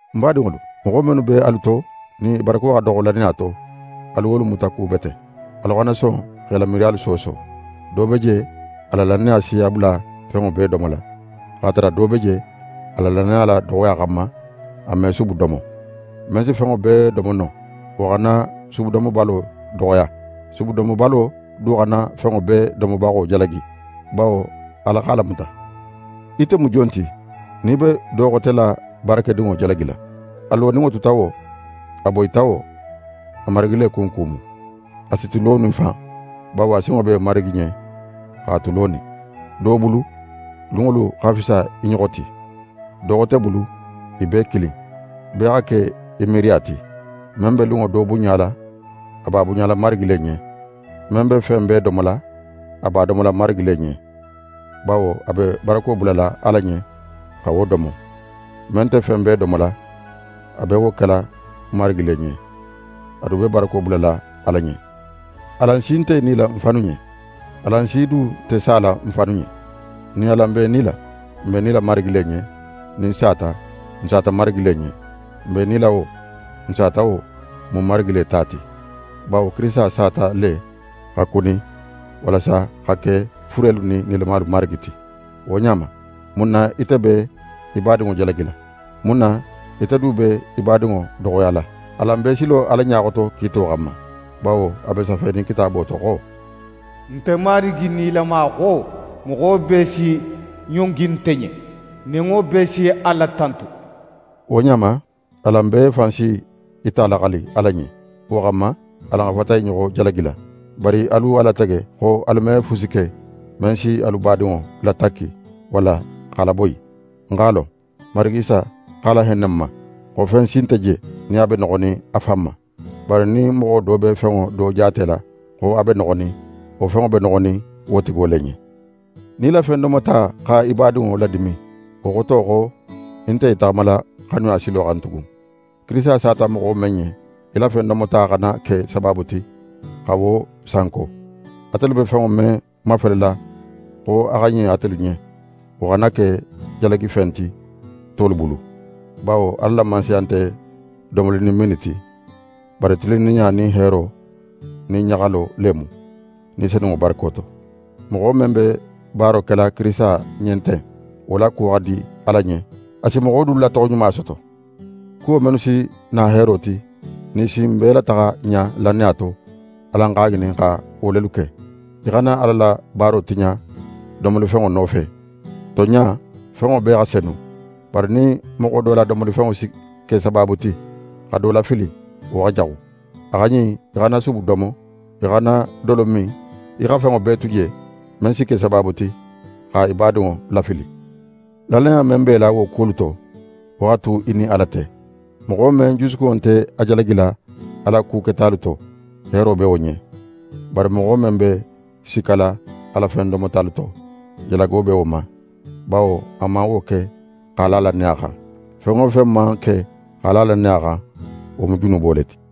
Ń badinŋolu, moxo mennu be alu to, nin i barako xa doxo lannaya to, alu wolu mutakubete. Alu xana son x'e la miiriyalu sooso. Do be je, a la lannaya si a bula fenŋo bee domola. X'a tara do be je, a la lannaya la doxoya xanma, a me subu domo. Men si fenŋo bee domo no, wo xana subudomobalo doxoya. Subudomobalo du xana fenŋo bee domobaxo jalagi, bawo Ala x'a lamuta. Ite mu jon ti nin í be do xote la baarakedinŋo jalagila? A loninŋo tuta wo, a boyita wo, a marigi le kunku mu. A si tu lonin fan, bawo a sinŋo be Marigi ɲen x'a tu lonin. Do bulu, lunŋolu xa fisa i ɲoxo ti. Do xote bulu, i bee kilin. Bee xa ke í miiriya ti. Men be lunŋo do bunɲala, a b'a bunɲala Marigi le ɲen. Men be fen bee domola, a b'a domola Marigi le ɲen, bawo a be barako bulala Ala ɲen xa wo domo. Men nte fen bee domola, a be wo kela Marigi le ɲen. A du be barako bulala Ala ɲen. Alan si nte í nila n fannu ɲen. Alan si du nte sala n fannu ɲen. Nin alan be i nila, n be i nila Marigi le ɲen. Nin n sata, n sata Marigi le ɲen. N be i nila wo, n sata wo, n mu Marigi le ta ti. Bawo Kirisita sata le xa kuni, walasa a xa ke furelu nin nilamalu Marigi ti. Wo ɲa ma, mun na ite be í badinŋo jalagila? Mun na ite du be í badinŋo doxoyala? Alan bee si lo Ala ɲa xoto kiito xanma. Bawo a be safenin Kitaabo to xo: «Nte Marigi Nilama xo: Moxo bee si ɲongi nte ɲen. Nenŋo bee si Ala tantu.» Wo ɲa ma, alan bee fan si í ta laxali Ala ɲen. Wo xanma, alan xa fata i ɲoxo jalagila, bari alu a latege xo alu me fusi ke, men si alu badinŋo latakki, walla x'a laboyi. Ń x'a lon, Marigi Isa x'a lahenne ń ma, xo fen si nte je, nin a be noxonin a fan ma. Bari nin moxo do be fenŋo do jaatela xo a be noxonin, wo fenŋo be noxonin wo tigo le ɲen. Nin í la fen domota xa í badinŋo ladimin, wo xoto xo í nte í taxamala xanuya silo xan tugun. Kirisita sata moxo men ɲen, í la fen domota xana ke sabaabu ti xa wo sanko. Atelu be fenŋo men mafelela xo a xa ɲin atelu ɲen, wo xana ke jalagifen ti tolu bulu. Bawo Ala la Mansaya nte domoli nin minni ti, bari tilinninɲa nin heero nin ɲaxalo le mu, Ni Senunŋo barako to. Moxo men be baaro kela Kirisita ɲen ten, wo la kuwo xa di Ala ɲen. A si moxo dulu la toxoɲuma soto. Kuwo mennu si na heero ti, nin i si n bee lataxa ɲa lannaya to, alan x'a ŋinin xa wo lelu ke. Í xana Ala la baaro tiɲa domolifenŋo nofe. Tonɲa, fenŋo bee xa senu. Bari nin moxo do la domolifenŋo si ke sabaabu ti xa do lafili, wo xa jaxu. A xa ɲin í xana subu domo, í xana dolo min, í xa fenŋo bee tu je, men si ke sabaabu ti xa í badinŋo lafili. Lannaya men b'é la wo kuwolu to, wo xa tu í nin Ala te. Moxo men jusukunŋo nte a jalagila a la ku ketalu to, heero be wo ɲen. Bari moxo men be sikkala a la fen domotalu to, jalago be wo ma, bawo a man wo ke x'a la lannaya xan. Fen wo fen man ke x'a la lannaya xan, wo mu junubo le ti.